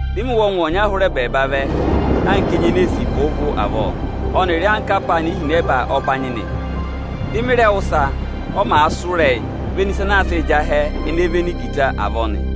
Dị mị wụ́ ọngwẹ ọnya hụrẹ ẹbẹẹba vẹ anka enyi ene ee sì vụụ-vụụ avọọ ọnịrị anka apaana ihinẹba ọbanyị nị. Dị mị rẹ wụ́ ịsa, ọ màa sụ́ ịrẹyịị véné ịsa anaa sịị̄ jị ahẹ ene véné igita avọọ nị.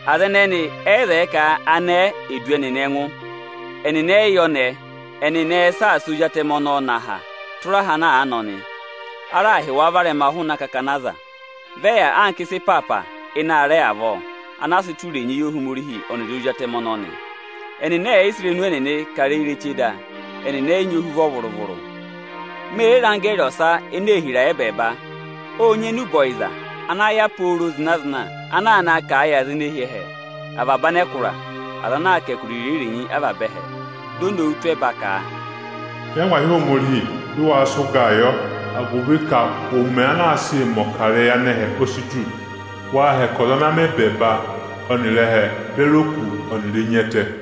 Aza ẹnẹnị ẹ yị zẹẹ ka anẹẹ è du ẹnị ẹngụ, ẹnịnị ẹ yị yẹ ọnẹẹ. Ẹnịnị ẹẹ̄ saasa Ozi Atẹmẹ ọnọọ nọ aha tụra aha ana àa nọ nị. A raà hị́ wa varẹma hụụnị akakana aza, vị ẹ yà anka ịsa ịnị aarẹ ịpaapa avọọ ana aā sịị tụ́ irenyi yị Ohomorihi ọnịrị Ozi Atẹmẹ ọnọọ nị. Ẹnịnị ẹ̀ yị sị irenu ẹnịnị kà ịrẹyị ireche da, ẹnịnị ẹyị nyị ohuvọ vụrụ-vụrụ. Me re re anggẹẹrị ọsa ene ee hira ẹ́bẹẹba. Ọ́ọ nyị enube ọyịza ana yà pooro zịna-zịna ana aa naa kà a yị aza ene hi ẹhẹ, avaba anẹkụra, aza ana aa kà ẹkụra irenyi-irenyi avaba ẹhẹ. Di o nowu tụ́ ẹba ka, “Nyị angwahi Ohomorihi, dị waa sị ụgaa yọ, agụvị ka ụmẹ ana aa sịị mẹ̀ ọkarẹyị anẹhẹ o si tù. Waa hẹkẹ ọza ana mẹ ẹbẹẹba ọnịrị ẹhẹ beri oku ọnịrị enyi ẹtẹ!”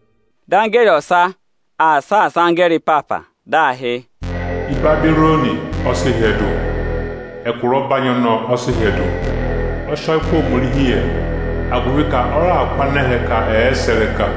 Dị anggẹẹrị ọsa aa saasa anggẹẹrị ịpaapa, dị aa hị́: “Ịbabịrọnị ọ sị hyẹdụ, ẹkụra ọbanyị ọnọọ ọ sị hyẹdụ; ọ sị ọyịkụ Ohomorihi yẹ, agụvị ka ọ raà kụ́ anẹhẹ ka ẹ̀ẹ sẹ̀ ịrẹka.”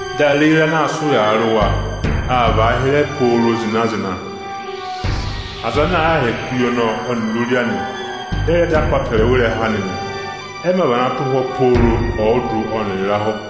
Dị areyi ịra ana aa sị ụyaa rị wa, aa vàa hịrẹ pooro zịna-zịna. Aza ana àa hẹkẹ uye ọnọọ ọnịrị ori anị dị ẹ rẹ dọ apọtẹrẹwa ịrẹha anị nị, ẹ mā vana tụ́ ụhwọ́ pooro ọọdụ ọnịrị ịrahụ.”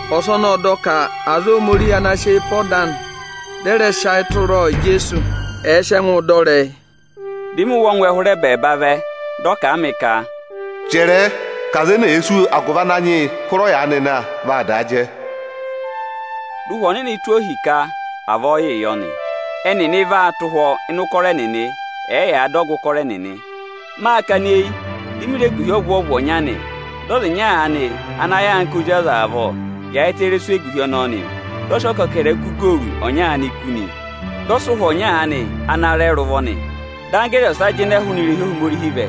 Ọsọnị ọ́ọ dọ ka aza Ohomorihi ana sị eyi pe ọda anị, dị ẹ rẹ sị ayị tụra Ijeesu, ẹ̀ẹ sị ẹngụụ dọ ịrẹyị. Dị mị wụ́ ọngwẹ hụrẹ ẹbẹẹba vẹ, dị ọ kà a mị ka, “Chẹrẹẹ ka aza ene èe sú agụvị Ananyị yị hụrẹ ọyaanị na, vaa daa jẹ! Dị Ụhwẹ Ọnịnị tụ́ ohi ka avọọ yịị yọ nị; ẹnịnị vaa tụ́ ụhwọ́ ịnị ụkọrọ ẹnịnị. Ẹyaa dọ ọgụ ụkọrọ ẹnịnị.” Máa kana eyi, di mi re eguhi ọvwọọvụ ọnya nị. Dị ọza ịnya aanị ana yà anka ozi ọza avọọ, yaayịtẹ ịrẹsụ eguhi ọnọọ nị. Dị ọ sị ọkẹkẹrẹkụ igooru ọnya aanị kú nị. Dị ọ sị ụhwọ ọnya aanị ana rẹ rị ụvọ nị. Dị anggẹẹrị ọsa jịnẹ hụụnị irehi Ohomorihi vẹ,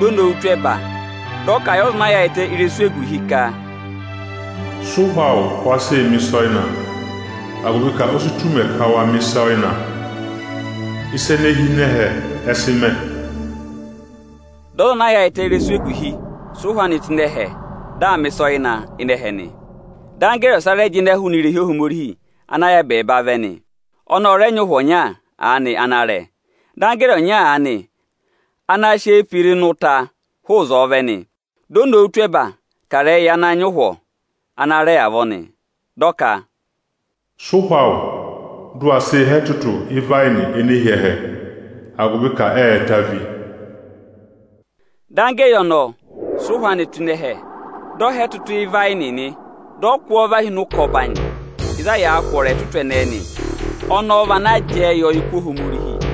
di o nowu tụ́ ẹba, dị ọ kà a yị ọza ana yaayịtẹ ịrẹsụ eguhi ka, “Sị ụhwọ awụ, wa sịị mẹ̀ ịsa ọyịna, agụvị ka o si tù ụmẹ ka wa mẹ̀ ịsa ọyịna, ịsa ene hi ịnị ẹhẹ ẹ sị mẹ!” Dị ọza ana yaayịtẹ ịrẹsụ eguhi sị ụhwọ anị tụ́ ịnị ẹhẹ, di aa mẹ̀ ịsa ọyịna ịnị ẹhẹ nị. Anggẹẹrị ọsa rẹ jịnẹ hụụnị irehi Ohomorihi ana yà ẹbẹẹba vẹ nị. Ọnị ọ rẹ nyị ụhwọ ọnya aanị ana rẹ. Dị anggẹẹrị ọnya aanị ana sị eyi pe ịra ịnị ụta hụụ ịzọọ vẹ nị. Di o nowu tụ́ ẹba kà ịrẹyị yị ana nyị ụhwọ ana rẹ avọọ nị, dị ọ ka, “Sị ụhwọ awụ, dụ wa sị há ẹtụtụ ịvayịnị ene hi ẹhẹ, agụvị ka ẹ́ẹ ta ví.” Dị anggẹẹrị sị ụhwọ anị tụ́ ịnị ẹhẹ, dị ọ há ẹtụtụ ịvayịnị nị. Dị ọ kụ́ ọọ và hi ụkọ ọbanyị ịzị a yàā kwọrọ ẹtụtụ ẹnẹẹ nị. Ọnọọ vị ana jẹẹ yị ọyịkụ Ohomorihi.